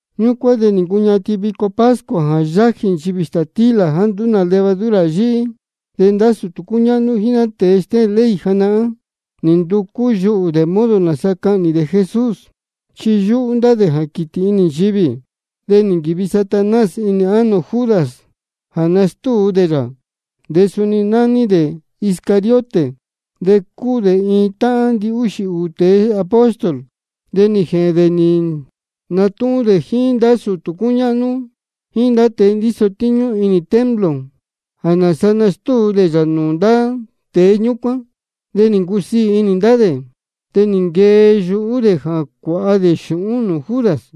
Ñúcuán de nī ncuñatin vico pascua jā yájī nchivī stātílā jāá nduú nā levadura yíhí. De ndá sūtū cúñáhnú jíín ndá tēe stéhēn ley janahán, nī nducú yuhū dē modo nāsa cahnī dē Jesús, chi yúhú ndá dē jā quītī inī nchivī. De nī nquīvi Satanás inī ánō Judas jā nastúu dē yā. De suni nání dē Iscariote, de cúu dē iin táhán ndihúxī ūū tēe apóstol. De nī jēhēn dē nī natúhún dē jíín ndá sūtū cúñáhnú jíín ndá tēe ndíso tíñú inī templo jā nāsa nastúu dē yā nūū ndá tēe ñúcuán. De nī ncusiī inī ndá dē, de nī nquee yuhú dē jā cuāha dē xūhún nūū Judas.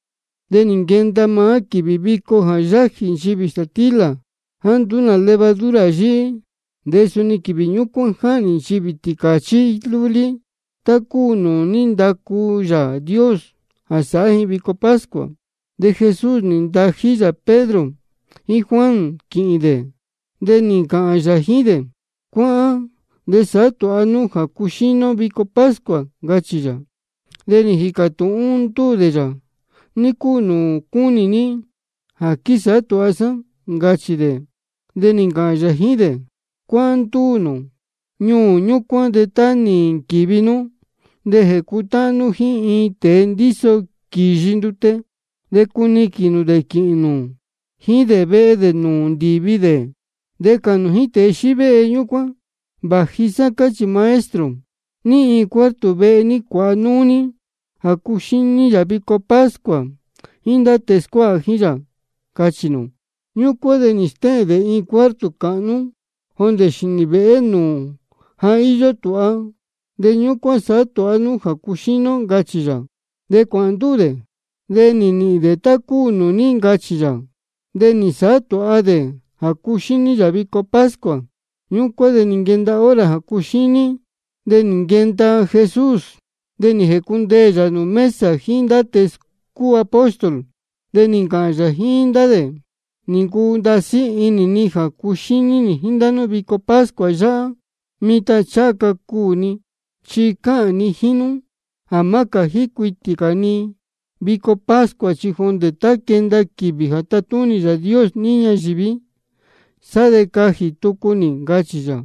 De nī nquenda maá quīvī vico jā yájī nchivī stātílā jāá nduú nā levadura yíhí, de suni quīvī ñúcuán jáhnī ji tīcāchí lúlí tá cúu nūū ní ndacu Yāā Dios jā sāhá ji vico pascua. De Jesús nī ntají yā Pedro jíín Juan quīhīn dē, de nī ncāhān yā jíín dē: Cuáhán de sāhá tūha nú jā cuxíní ó vico pascua, ncachī yā. De nī jīcā tūhún ndúū dē yā: ¿Ní cúu nūū cúnī ní jā quísāhá tūha sá? ncachī dē. De nī ncāhān yā jíín dē: Cuáhán ndúū nū ñuū ñúcuán de tá nī nquīvi nú de jēcutáhán nú jíín iin tēe ndíso quīyi ndute. De cuniquīn nū dē quīhīn nū jíín dē vehe nūū ndīvi dē. De cāhān nū jíín tēe xívéhe ñúcuán: Vāji sá cáchī Maestro: ¿Ní iin cuarto vehe ní cuāha núú ní jā cuxíní yā vico pascua jíín ndá tēe scuáha jíín yā? cachī nū. Ñúcuán de stéhēn dē iin cuarto cāhnú jondē xīnī vēhé nūū ja íyó tūha, de ñúcuán sāhá tūha nú jā cuxíní ó, ncachī yā. De cuāhān ndúū dē, de nī nīhīn dē tá cúu nūū ní ncachī yā. De nī nsāhá tūha dē jā cuxíní yā vico pascua. Ñúcuán de nī nquenda hora jā cuxíní, de nī nquenda Jesús, de nī jēcundeē yā nūū mesa jíín ndá tēe cúu apóstol. De nī ncāhān yā jíín ndá dē: Nī ncuu ndasí inī ni jā cuxíní nī jíín ndá nú vico pascua yáhá, mitan ncháha ca cuū ni. Chi cáhān ni jíín nú jā má cājí cuitī cā ni vico pascua, chi jondē tá quenda quīvī jā tatúnī Yāā Dios níí ñayīví, sá de cajī tucu nī, ncachī yā.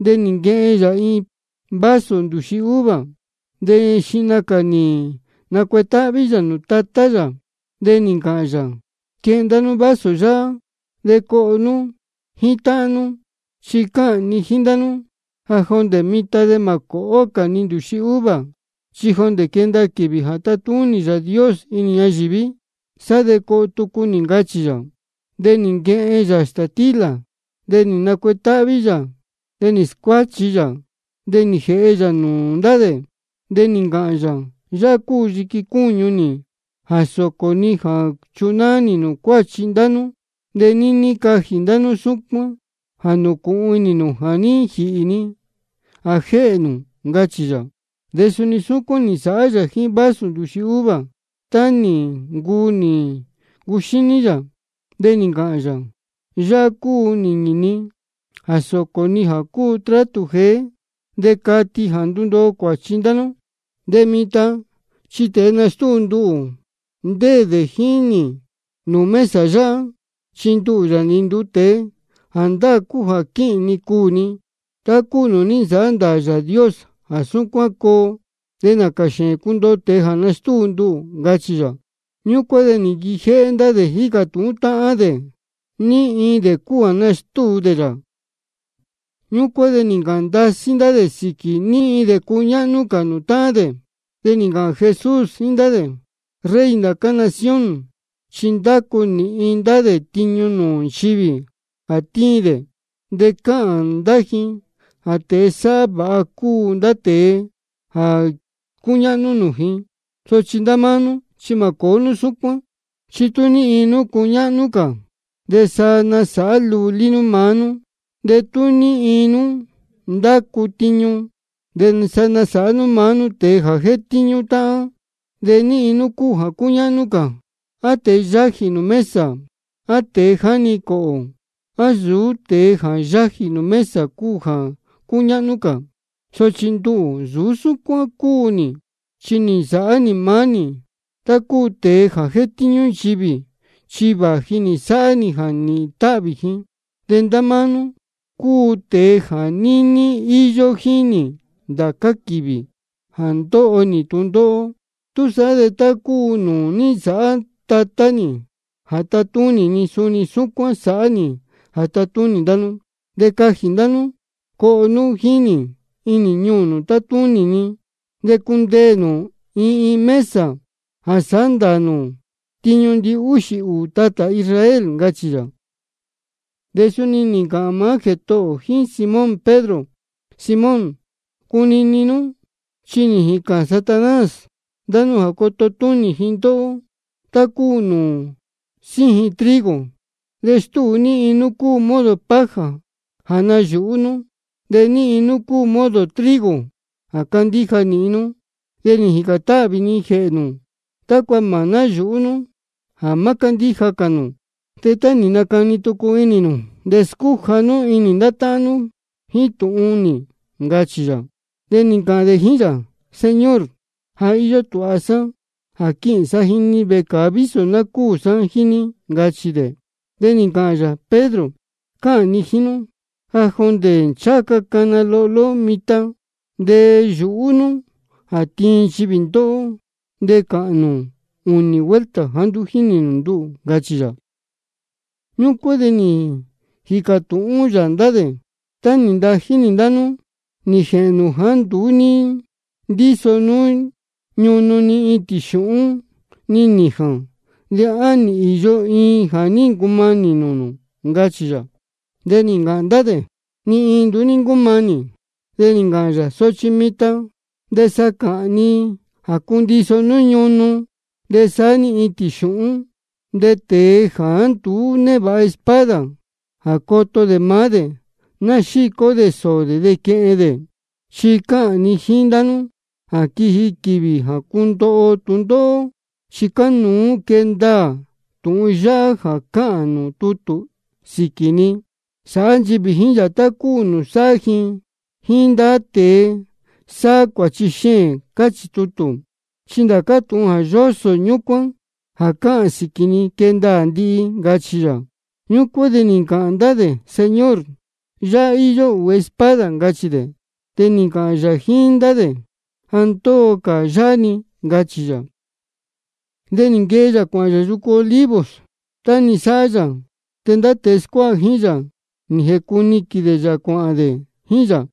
De nī nquehen yā iin vaso ndūxi uva, de xihna cā nī nacuetáhví yā nūū Tatá yā, de nī ncāhān yā: Quehen ndá nú vaso yáhá, de coho nú jíín táhán nú. Chi cáhān ni jíín ndá nú jā jondē mitan de mā cōhó cā ni ndūxi uva, chi jondē quenda quīvī jā tatúnī Yāā Dios níí ñayīví, sá de coho tucu nī, ncachī yā. De nī nquehen yā stātílā, de nī nacuetáhví yā, de nī scuáchi yā, de nī jēhe yā nūū ndá dē. De nī ncāhān yā: Yáhá cúu yiqui cúñu nī jā sōcō ni jā chunáá nī cuāchi ndá nú. De níní cajī ndá nú súcuán jā nūcūhun inī nū jā ní jīhī ni jā jéhē nū, ncachī yā. De suni súcuán nī nsāhá yā jíín vaso ndūxi uva, tá nī ncuu nī ncuxíní yā. De nī ncāhān yā: Yáhá cúu nīñī ni jā sōcō ni jā cúu trátū jeé, de cati jā ndundoo cuāchi ndá nú. De mitan chi tēe nastúu nduhū, ndéē dē jíín nī nūū mesa yáhá. Chi nduhū, Yāā nī nduu tēe, jāndáā cúu jā quíhīn ni cuū ni, tá cúu nūū ní nsāhá ndāā Yāā Dios jā súcuán coo. De nācā xēēn cundoho tēe jā nastúu nduhū, ncachī yā. Ñúcuán de nī nquijéhé ndá dē jícā tūhún táhán dē ní iin dē cúu jā nastúu dē yā. Ñúcuán de nī ncāhān ndasí ndá dē sīquī ní iin dē cúñáhnú cā nūū táhán dē. De nī ncāhān Jesús jíín ndá dē: Rey ndācá nación chi ndácu nīhin ndá dē tiñu nūū nchivī jā tíin dē, de cáhān ndá ji jā tēe sáhá vāha cúu ndá tēe jā cúñáhnú nūū ji. Sochi ndá máá nú, chi mā cōó nú súcuán. Chi tú ní iin nú cúñáhnú cā, de sa nasāhá lulí nú maá nú. De tú ní iin nú ndácu tiñu, de sa nasāhá nú maá nú tēe jā jétíñú táhán. ¿De ní iin cúu jā cúñáhnú cā, á tēe yájī nūū mesa, á tēe jáni cōhō? ¿A nsūú tēe jā yájī nūū mesa cúu jā cúñáhnú cā? Sochi nduhū, nsūú súcuán cúu nī, chi nī nasāhá nī maá nī tá cúu tēe jā jétíñú nchivī, chi vāji nī sáhá nī jā nīhīn táhvī ji. De ndá máá nú cúu tēe jā níní íyó jíín nī ndācá quīvī jā ndóho nī tūndóhó. Túsaá de tá cúu nūū ní nsāhá Tatá nī jā tatúnī ni, suni súcuán sāhá nī jā tatúnī ndá nú. De cajī ndá nú coho nú jíín nī inī ñuū nūū tatúnī ni. De cundeē nū iin iin mesa jā sāhá ndāā nū tiñu ndihúxī ūū tatā Israel, ncachī yā. De suni nī ncāhān maá Jētohō ō jíín Simón Pedro: Simón, cunini nú, chi nī jīcān Satanás ndá nú jā coto túnī ji ndóhó tá cúu nūū síjin trigo, de stúu ní iin nú cúu modo paja jā nayūhú nú, de ní iin nú cúu modo trigo jā cándíja nīhin nú. De nī jīcān táhvī ni jēhē nū, tácua mā náyūhú nú jā má cándíja cā nū. De tá nī nacani tucu inī nū, de scúja nú inī ndá táhán nú jíín tūhun nī, ncachī yā. De nī ncāhān dē jíín yā: Señor, ja íyó tūha sá jā quīhīn sá jíín ní vecāa vísō ná cúū sá jíín ní, ncachī dē. De nī ncāhān yā: Pedro, cáhān ni jíín nú jā jondē ncháha ca cana lohló mitan, de yūhú nú jā tiin nchivī ndóhó, de cachī nū ūnī vuelta jāá nduú jínī nū nduhū, ncachī yā. Ñúcuán de nī jīcā tūhún yā ndá dē: Tá nī ntají nī ndá nú nī jēhēn nū jāá nduú ní ndíso nú ñunu ni itīn xūhún ni nījān, ¿de á nī īyo iin jā ní ncumanī nūū nū? ncachī yā. De nī ncāhān ndá dē: Ni iin nduú ní ncúmanī. De nī ncāhān yā: Sochi mitan de sa cáhān ni jā cundiso nú ñunu nú, de saá-ni itīn xūhún. De tēe jāá nduú névāha espada jā coto dē maá dē, ná xícó dē sōō dē de quehen dē. Chi cáhān ni jíín ndá nú jā quiji quīvī jā cundoho ó tūndóhó, chi cánuú quee ndaā tūhun yáhá jā cáhān nūū tutū sīquī ni: Sāhá nchivī jíín yā tá cúu nūū sáhá ji jíín ndá tēe sáhá cuāchi xēēn, cáchī tutū. Chi ndācá tūhun yósō ñúcuán jā cáhān sīquī ni, quee ndaā ndihi, ncachī yā. Ñúcuán de nī ncāhān ndá dē: Señor, yáhá íyó ūū espada, ncachī dē. De nī ncāhān yā jíín ndá dē: Ja ndóo cā yáhá-ni, ncachī yā. De nī nquee yā cuāhān yā yucu Olivos, tá-ni sáhá yā. De ndá tēe scuáha jíín yā, nī jēcuniquīn dē yā cuāhān dē jíín yā.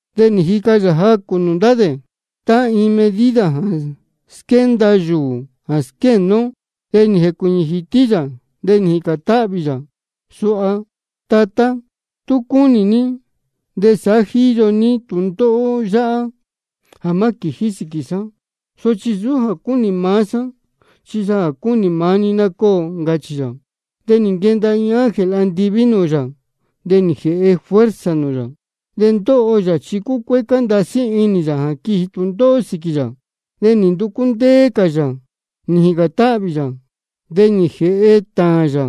De nī jica yā jacū nūū ndá dē, tá iin medida jā quenda yūū jā squéne ó. De nī jēcuīñī jītí yā, de nī jīcān táhvī yā suha: Tatá, tú cúnī ní de sāhá jíyo ní tūndóhó yáhá jā má quījí sīquī sá. Sochi nsūú jā cúnī maá sá, chi jā cúnī maá ní ná cóo, ncachī yā. De nī nquenda iin ángel andiví nūū yā, de nī jēhe fuerza nūū yā. De ndóho yā chi cúcuécá ndasí inī yā jā quiji tūndóhó sīquī yā, de nī nducú ndéé cā yā nī jīcān táhvī yā. De nī jēhe tāān yā,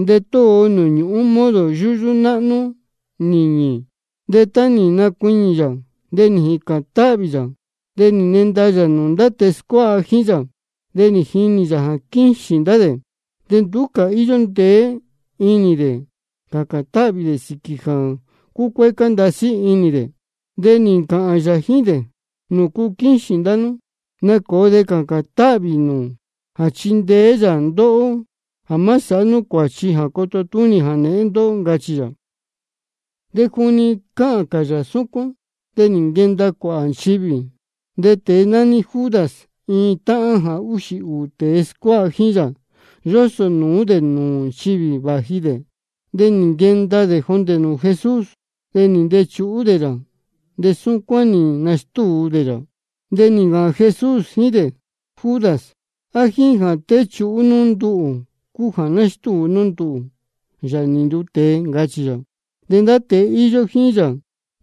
de tóo nūū ñūhún modo yúyú náhnú nīñī. De tá nī nacuiñī yā jā ní jīcān táhvī yā, de nī nenda yā nūū ndá tēe scuáha jíín yā. De nī jinī yā jā quíxīn ndá dē, chi nduú cā íyó ndeé inī dē cācān táhvī dē sīquī jā cúcuécá ndasí inī dē. De nī ncāhān yā jíín dē: ¿Nūcu quíxīn ndá nú? Nacōo de cācān táhvī nū jā chindeé yā ndóhó jā má sāhá nú cuāchi jā coto túnī jānēhén ndóhó, ncachī yā. De juni cáhān cā yā súcuán, de nī nquenda cuāhā nchivī. De tēe nání Judas, iin táhán jā úxī ūū tēe scuáha jíín yá, yósō nūú dē nūū nchivī vāji dē. De nī nquenda dē jondē nūū Jesús, de nī ntechuhú dē yā, de súcuán nī nastúu dē yā. De nī ncāhān Jesús jíín dē: Judas, ¿á jíín jā téchuhú nú nduhū cúu jā nástúu nú nduhū, Yāā nī nduu tēe? ncachī yā. De ndá tēe íyó jíín yā,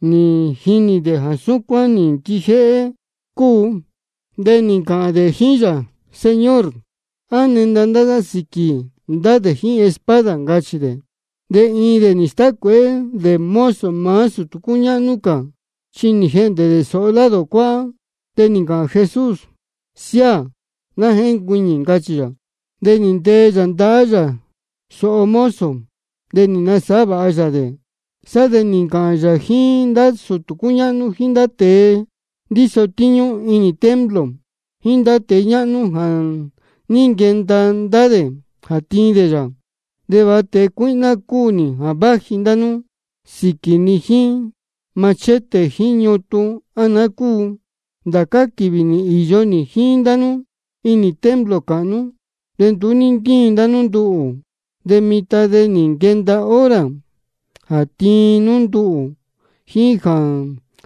nī jinī dē jā súcuán nī nquijéhé cúu, de nī ncāhān dē jíín yā: Señor, ¿á nenda ndá sá sīquī ndá dē jíín espada? ncachī dē. De iin dē nī stácuēhé dē mozo maá sūtū cúñáhnú cā, chi nī jehndē dē sōho lado cuáhá. De nī ncāhān Jesús: Siáā, ná jéncuiñī, ncachī yā. De nī ntee yā ndahá yā sōho mozo, de nī nasāhá vāha yā dē. Sá de nī ncāhān yā jíín ndá sūtū cúñáhnú jíín ndá tēe ndíso tíñú inī templo jíín ndá tēe ñáhnú jā ní nquenda ndá dē jā tiin dē yā: ¿De va tēe cuíhná cúu nī jā váji ndá nú sīquī ni jíín machete jíín ñutun, á naá cúu? Ndācá quīvī nī īyo nī jíín ndá nú inī templo cāhnú, de nduú ní ntíin ndá nú nduhū. De mitan de nī nquenda hora jā tiin nú nduhū jíín jā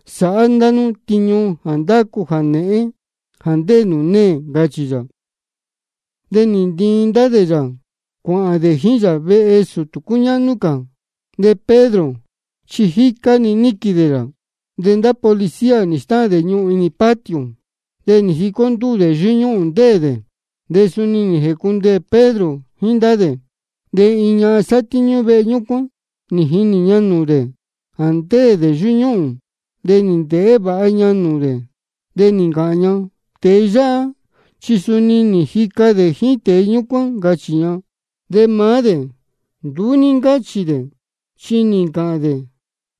sāhá nú ndá tiñu jā ndácu jānēhén jā ndéē nūū neē, ncachī yā. De nī ntiin ndá dē yā cuāhān dē jíín yā vehe sūtū cúñáhnú cā. De Pedro chi jícá-ni níquīn dē yā. De ndá policía nī stáhān dē ñuhūn inī patio, de nī jicó ndúū dē yúñúhūn ndéē dē. De suni nī jēcundeē Pedro jíín ndá dē. De iin ñahan sátíñú vehe ñúcuán, nī jinī ña nūū dē jā ndéē dē yúñúhūn. De nī ndēhé vāha ña nūū dē, de nī ncāhān ña: Tēe yáhá chi suni nī jica dē jíín tēe ñúcuán, ncachī ña. De maá dē nduú ní ncáchī dē, chi nī ncāhān dē: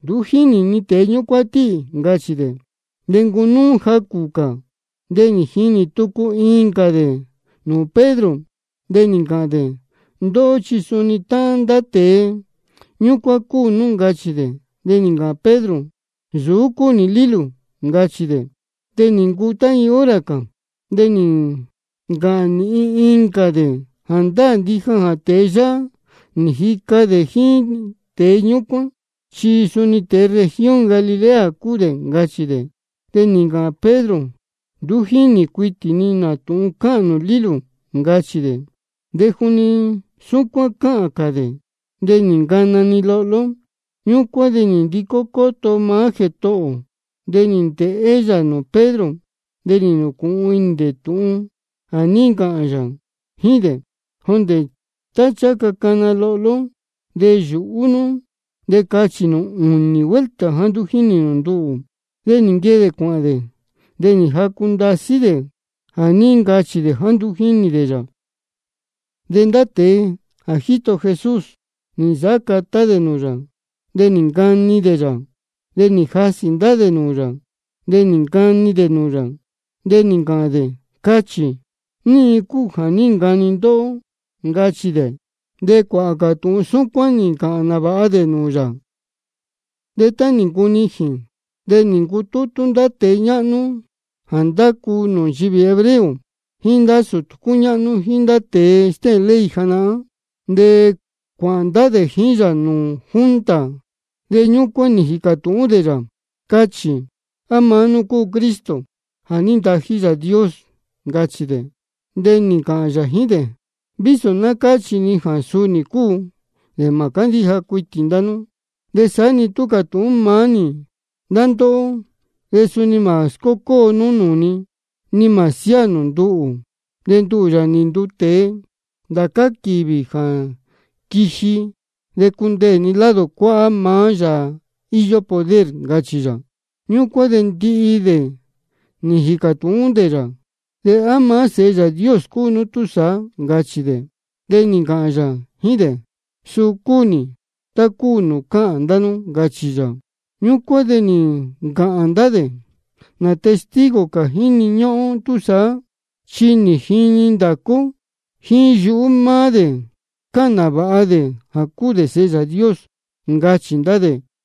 Nduú jínī ni tēe ñúcuán tíhī, ncachī dē. De nī ncunúú jacū cā, de nī jinī tucu incā dē nūū Pedro, de nī ncāhān dē: Ndóhó chi suni táhán ndá tēe ñúcuán cúu nú, ncachī dē. De nī ncāhān Pedro: Nsūú cúu nī lílū, ncachī dē. De nī ncuu tá iin hora cā, de nī ncāhān nīhin incā dē: Jāndáā ndija jā tēe yáhá nī jica dē jíín tēe ñúcuán, chi suni tēe región Galilea cúu dē, ncachī dē. De nī ncāhān Pedro: Nduú jínī cuitī ni nā tūhun cáhān nū lílū, ncachī dē. De juni súcuán cáhān cā dē, de nī ncana-ni lohló. Ñúcuán de nī ndicó cóto maá Jētohō ō, de nī ndēhé yā nūū Pedro. De nī nūcūhun inī dē tūhun jā ní ncāhān yā jíín dē: Jondē tá ncháha ca cana lohló, de yūhú nú de cachī nū ūnī vuelta jāá nduú jínī nū nduhū. De nī nquee dē cuāhān dē, de nī jacu ndasí dē jā ní ncachī dē jāá nduú jínī dē yā. De ndá tēe jā jíto Jesús, nī nsāhá catá dē nūū yā, de nī ncani dē yā. De nī jasī ndá dē nūū yā, de nī ncani dē nūū yā, de nī ncāhān dē: Cachī, ní iin cúu jā ní ncani ndóhó, ncachī dē. De cuāhā cā tūhun súcuán nī ncāhān nāvāha ndá dē nūū yā. De tá nī ncunijīn, de nī ncutútú ndá tēe ñáhnú jā ndácu nūū nchivī hebreo, jíín ndá sūtū cúñáhnú, jíín ndá tēe stéhēn ley janahán. De cuāhān ndá dē jíín yā nūū junta, de ñúcuán de nī jīcā tūhún dē yā: Cachī, ¿á maá nú cúu Cristo jā ní ntají Yāā Dios? ncachī dē. De nī ncāhān yā jíín dē: Vísō ná cáchī ni jā suu nī cúu, de mā cándíja cuitī ndá nú. De saá-ni tú cātūhún maá nī ndá ndóhó, de suni mā scócóo nú nūū ni, ni mā siáā nū nduhū. De nduhū, Yāā nī nduu tēe, ndācá quīvī jā quiji de cundeē ni lado cuáhá maá Yāā íyó poder, ncachī yā. Ñúcuán de ndihi dē nī jīcā tūhún dē yā: ¿De á maá nú cúu Sēhe Yāā Dios túsaá? ncachī dē. De nī ncāhān yā jíín dē: Suu cúu nī, tá cúu nūū cáhān ndá nú, ncachī yā. Ñúcuán de nī ncāhān ndá dē: ¿Nā testigo cā jíni ñúhún ó túsaá? Chi nī jini ndācá ó jíín yuhú maá dē jā cáhān nāvāha dē jā cúu dē Sēhe Yāā Dios, ncachī ndá dē.